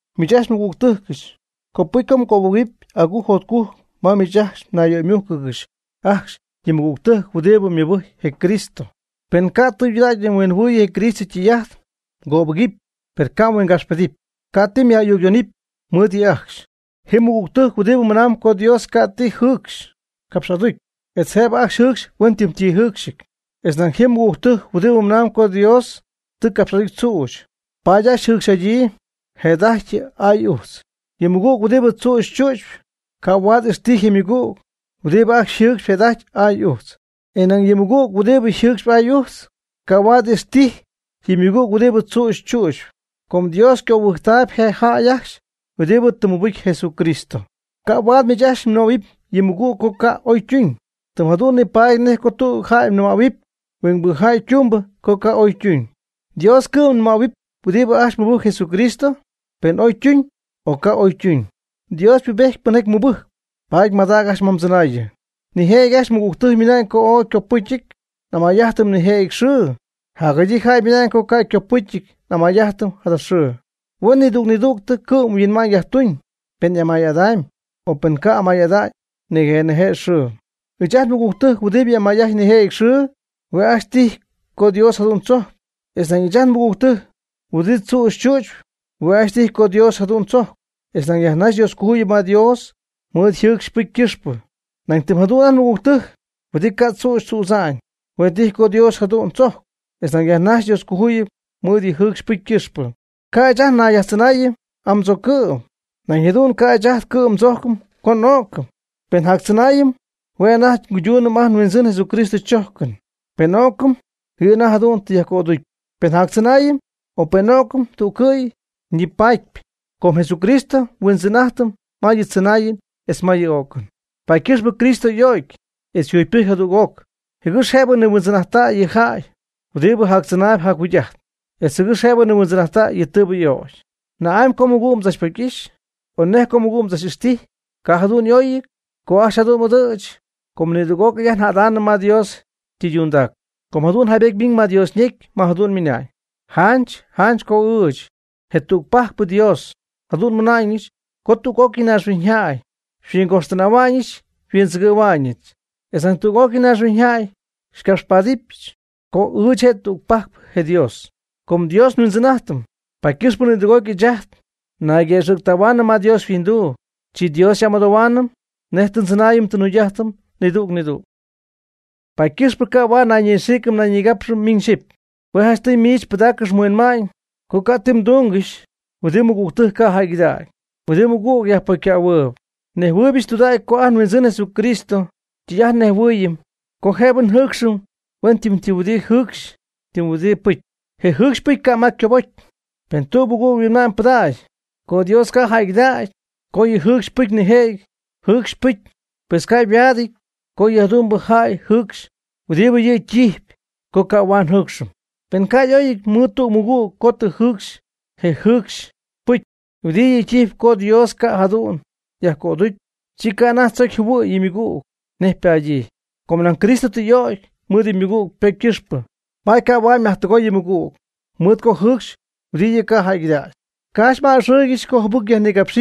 Miich ajcxy nmɨgügtɨjcɨch, copɨcy mgöbɨgɨpy agujc jotcujc ma miich mnayyöymújcɨgɨxy ajcxy yɨ mɨgügtɨjc huɨdibɨ mɨbɨjcp je Cristo, per ca' tɨydudägy huinjɨhuɨ̈y je Cristo ytɨy'ajt. Mgöbɨgɨpy per ca' mhuingapxpedɨpy, ca' ti myaj'ayucyoonɨpy mɨɨd yɨ' ajcxy. Ti mɨgügtɨjc huɨdibɨ mɨnamb co Dios ca' ti jɨɨcxy capx'aducy, etz jëbɨ ajcxy jɨcxy huenytɨm ti jɨɨcxyɨty. Etz nañ ji mɨgügtɨjc huɨdibɨ mɨnam co Dios tɨ capx'aducy tzüch, paady ajcxy jɨcxy'adyii je'jada'ajty aay ujtz. Yɨ mɨgüg huɨdibɨ tzüch tzützp ca' huaad ixtijy je ymɨgüg huɨdibɨ yjɨcxpy je'jada'ajty aay ujtz. E nañ ni yɨ mɨgüg huɨdibɨ jɨcxp aay ujtz ca' huaad ixtijy yɨ mɨgüg huɨdibɨ tzüch tzu'tzp, com Dios ycöbɨjctaayb je jäy ajcxy huɨdibɨ tɨ mɨbɨcy Jesucristo. Ca' huaad miich ajcxy mnɨmähuɨpy yɨ mmɨgüg co ca' oytuñ, tɨm jadu'n nipaady nej co tüg jäy nɨmähuɨpy huingbɨ jäy ytumbɨ co ca' oy ytuñ. Dios cɨ'm nɨmähuɨp huɨdi ajcxy mɨbɨjcp Jesucristo, pen oytuñ o ca' oytuñ. Dios ypubejtyp pɨnjaty mɨbɨjcp, paady madaacp ajcxy ma chɨnaayɨn. Nijëjɨty ajt nmɨgügtɨjc ymɨna'ñ co ooy ycopɨcyɨty n'amay'ajtɨm nijëjɨty xɨɨ, jacjadyii jäy ymɨna'ñ co ca' ycopɨcyɨty n'amay'ajtɨm jada xɨɨ. Huen nidüg nidüg ycɨ'mhuinma'ñ yajtuñ pen y'amay'adamyb, o pen ca' amay'ada'ñ nije' nije' xɨɨ. Ɨɨch ajt nmɨgügtɨjc huɨdi amay'ajtp nijëjɨty xɨɨ, hue' ajcxy tijy co Dios jadu'n tzojcp. E nañ ɨɨch ajt nmɨgügtɨjc huɨdi tzüch tzu'tzp, hue' ajcxy tijy co Dios jadu'n tzojcp, etz nañ yajnajxyp Dioscojuyip ma Dios mɨɨd yjɨɨcxy ypɨcy ycɨxpɨ. Nañ tɨm jadu'n ajt nmɨgügtɨjc huɨdi ca' tzüch tzüdza'ñ, hue' tijy co Dios jadu'n tzojcp, etz nañ yajnajxyp Dioscojuyip mɨɨd yjɨɨcxy ypɨcy ycɨxpɨ. Ca' ɨɨch ajt nayyajtzɨnaayɨm amɨdzoocɨ'm, nañ jadu'n ca' ɨɨch ajt cɨ'm ndzojcɨn co n'o'cɨm. Pen njactzɨnaayɨm hue' anajty nguyduunɨm ajt nHuindzɨn Jesucristo chojcɨn. Pen n'o'cɨm yɨ' anajty jadu'n tɨ yajcöducy. Pen njactzɨnaayɨm, o pen n'o'cɨm, tú'cɨy nipaady, com Jesucristo nHuindzɨn'ajtɨm ma yɨ tzɨnaayɨn etz ma yɨ o'cɨn. Paady ycɨxp Cristo y'o'cy etz yjugypɨjcy jadüg'oc jɨgɨx jëb nihuindzɨn'ajttäy yɨ' yjäy huɨdibɨ jactzɨnaayb jacjugy'ajtp, etz jɨgɨx jëb nihuindzɨn'aty yɨ tɨɨbɨ y'ögy. ¿Na'amy co mmɨgüg mdzachpocy'ixy? o ¿Nej co mmɨgüg mdzach'ixtijy? Ca' jadu'n y'oyɨty co ajcxy jadu'n m'ɨdɨ̈ch. Com nidüg'ócɨy ajt njädaanɨm ma Dios ytɨydundac. Com jadu'n jaybety ymiñ ma Dios ñecy, ma jadu'n ymɨna'ñ: Janch janch co ɨɨch, je tügpajcpɨ Dios, jadu'n nmɨna'ñɨch co tüg'ócɨy naaxhuiñyjäy xyhuingoxtɨnähuɨbɨch xyhuindzɨgɨ̈huɨbɨch, etz nañ tüg'ócɨy naaxhuiñyjay xycapxpaadɨbɨch co ɨɨch je' tügpajcpɨ je Dios. Com Dios nhuindzɨn'ajtɨm, paady ycɨxp nidüg'ócɨy ɨɨch ajt nayguëxɨ̈ctähuaanɨm ma Dios yhuinduu, chi Dios xy'amɨdohuaanɨm nej tɨ ndzɨnaayɨm tɨ njugy'ajtɨm nidüg nidüg. Paady ycɨxpɨ ca' huaad naynixiic naynigapxɨm miñ xyɨpy. Hue' janchtɨy miich pɨdaaccɨx mhuinma'ñ co ca' ti mdúngɨxɨpy huɨdi mmɨgügtɨjc ca' jäygɨdägy, huɨdi mmɨgüg yajpocycähuɨɨb. Nnejhuɨɨybɨch tɨydudägy co ajt nHuindzɨn Jesucristo ytɨy'ajt xyajnejhuɨɨyɨm co jëbɨ njɨɨcxɨm huen tɨm huɨdi jɨcxy tɨm huɨdi pɨcy. Je jɨcxy je pɨcy ca' ma ycobocy. Per pen tüg mɨgüg yhuinma'ñ pɨdacp co Dios ca' jäygɨdägy co yɨ' yjɨcxpy nijëjɨty jɨcxy pɨcy, pues ca' yhuaadɨty co yɨ jadu'mbɨ jäy jɨcxy huɨdi yɨ' ytijpy co ca' huaad njɨcxɨm. Pen ca' m'oy'ity mɨɨd tüg mɨgüg co tɨ mjɨcxy je jɨcx pɨcy huɨdibɨ yɨ' ytijpy co Dios ca' jadu'n yaj'cöducy, chi ca' anajty mdzocy mjɨhuɨ̈y yɨ mmɨgüg nej ypadyii. Com nañ Cristo tɨ y'ögy mɨɨd yɨ mmɨgüg ypocy ycɨxpɨ, paady ca' huaad myajtɨgoy yɨ mmɨgüg, mɨɨd co mjɨcxy huɨdi yɨ' ca' jäygɨdägy. Ca' ajcxy m'a'ɨxɨ́ɨygɨxɨpy co jɨbɨc yajnigapx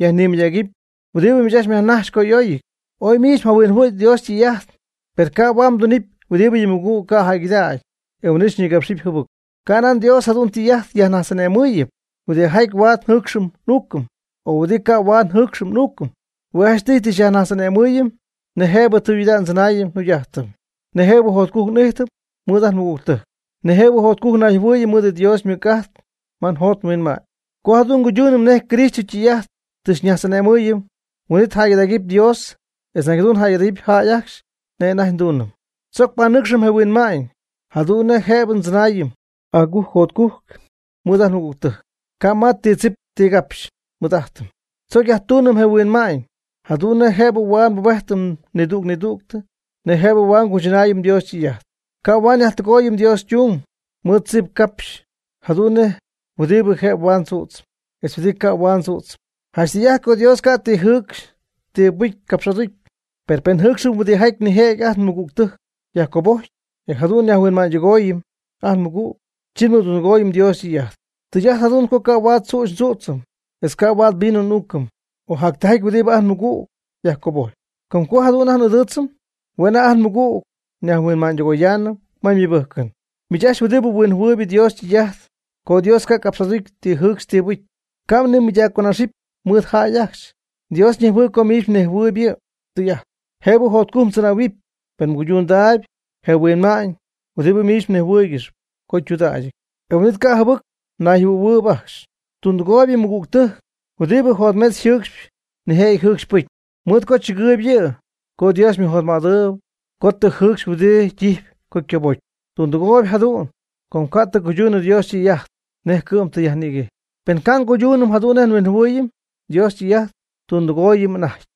yajnimɨydägɨpy huɨdibɨ miich ajcxy myajnajxp co y'oyɨty. Oy miich mjahuinjɨhuɨ̈y Dios ytɨy'ajt, per ca' huaad mdunɨpy huɨdi yɨ mmɨgüg ca' jäygɨdägy, e huin'it xyñigapxɨpy jɨbɨc. Canan Dios jadu'n ytɨy'ajt xyñajtz'ane'mɨɨyɨm huɨdijaty huaad njɨcxɨm n'uucɨm, o huɨdi ca' huaad njɨcxɨm n'uucɨm. Hue' janchtɨy tɨ xyñajtz'ane'mɨɨyɨm nej jëbɨ tɨydudägyɨ ndzɨnaayɨm njugy'ajtɨm. Nej jëbɨ jotcujc n'ijtɨm mɨɨd ajt nmɨgügtɨjc. Nej jëbɨ jotcujc nayjɨhuɨɨyɨm mɨɨd Dios ymɨc'ajt ma njot nhuinma'ñ. Co jadu'n nguyduunɨm nej Cristo ytɨy'ajt tɨ xyñajtz'ane'mɨɨyɨm, huin'it jäygɨdägɨpy Dios etz nañ jadu'n jäygɨdägɨpy jäy ajcxy nej anajty nduunɨm. Tzoc panɨcxɨm je huinma'ñ jadu'n nej jëbɨ ndzɨnaayɨm agujc jotcujc mɨɨd ajt nmɨgügtɨjc, ca' ma ti tzip ti capxy nmɨɨd'ajtɨm. Tzoc yajtuunɨm je huinma'ñ jadu'n nej jëbɨ huaad naybubejtɨm nidüg nidüg nej jëbɨ huaad nguychɨnaayɨm Dios ytɨy'ajt. Ca' huaad nyajtɨgooyɨm Dios ytung mɨɨd tzip capxy jadu'n nej huɨdi jëbɨ huaad ndzüdzɨm, etz huɨdibɨ ca' huaad ndzüdzɨm. Janch tɨy'ajt co Dios ca' ti jɨcxy ti pɨcy capx'aducy, per pen njɨcxɨm huɨdijaty nijëjɨty ajt nmɨgügtɨjc yajcobojcpy, e jadu'n nyajhuinma'ñydɨgooyɨm ajt nmɨgüg, chi nmɨdundɨgooyɨm Dios ytɨy'ajt. Tɨy'ajt jadu'n co ca' huaad tzüch ndzüdzɨm etz ca' huaad vino n'uucɨm, o jactijaty huɨdibɨ ajt nmɨgüg yajcobojcpy. Com co jadu'n ajt n'ɨdɨɨdzɨm, hue' anajty ajt nmɨgüg nyajhuinma'ñydɨgoyaanɨm ma ymɨbɨjcɨn. Miich ajcxy huɨdibɨ huinjɨhuɨɨyb Dios ytɨy'ajt co Dios ca' capx'aducy ti jɨcxɨn ti pɨjcɨn, ca' mnimɨydacconaxɨpy mɨɨd jäy ajcxy. Dios ñejhuɨɨyb co miich mhuinjɨhuɨ̈y yɨ' ytɨy'ajt. Jëbɨ jotcujc mdzɨnähuɨpy pen mguychɨnaayb je huinma'ñ huɨdibɨ miich mnejhuɨɨygɨxyp co ytudägyɨty, e huin'it ca' jɨbɨc mnayjɨhuɨ̈huɨɨyb ajcxy. Tundɨgooyb yɨ mɨgügtɨjc huɨdibɨ jotmetz jɨɨcxp nijëjɨty jɨcxy pɨcy, mɨɨd co tzɨgɨɨyb yɨ' co Dios ymɨjotmädɨɨyb co tɨ jɨcxy huɨdi ytijpy co ycobocy. Tundɨgooyb jadu'n com ca' tɨ cuydunɨ Dios ytɨy'ajt nej cɨ'm tɨ yajnïguejy. Pen ca' nguyduunɨm jadu'n nej nhuinjɨhuɨɨyɨm Dios ytɨy'ajt, tundɨgooyɨm anajty.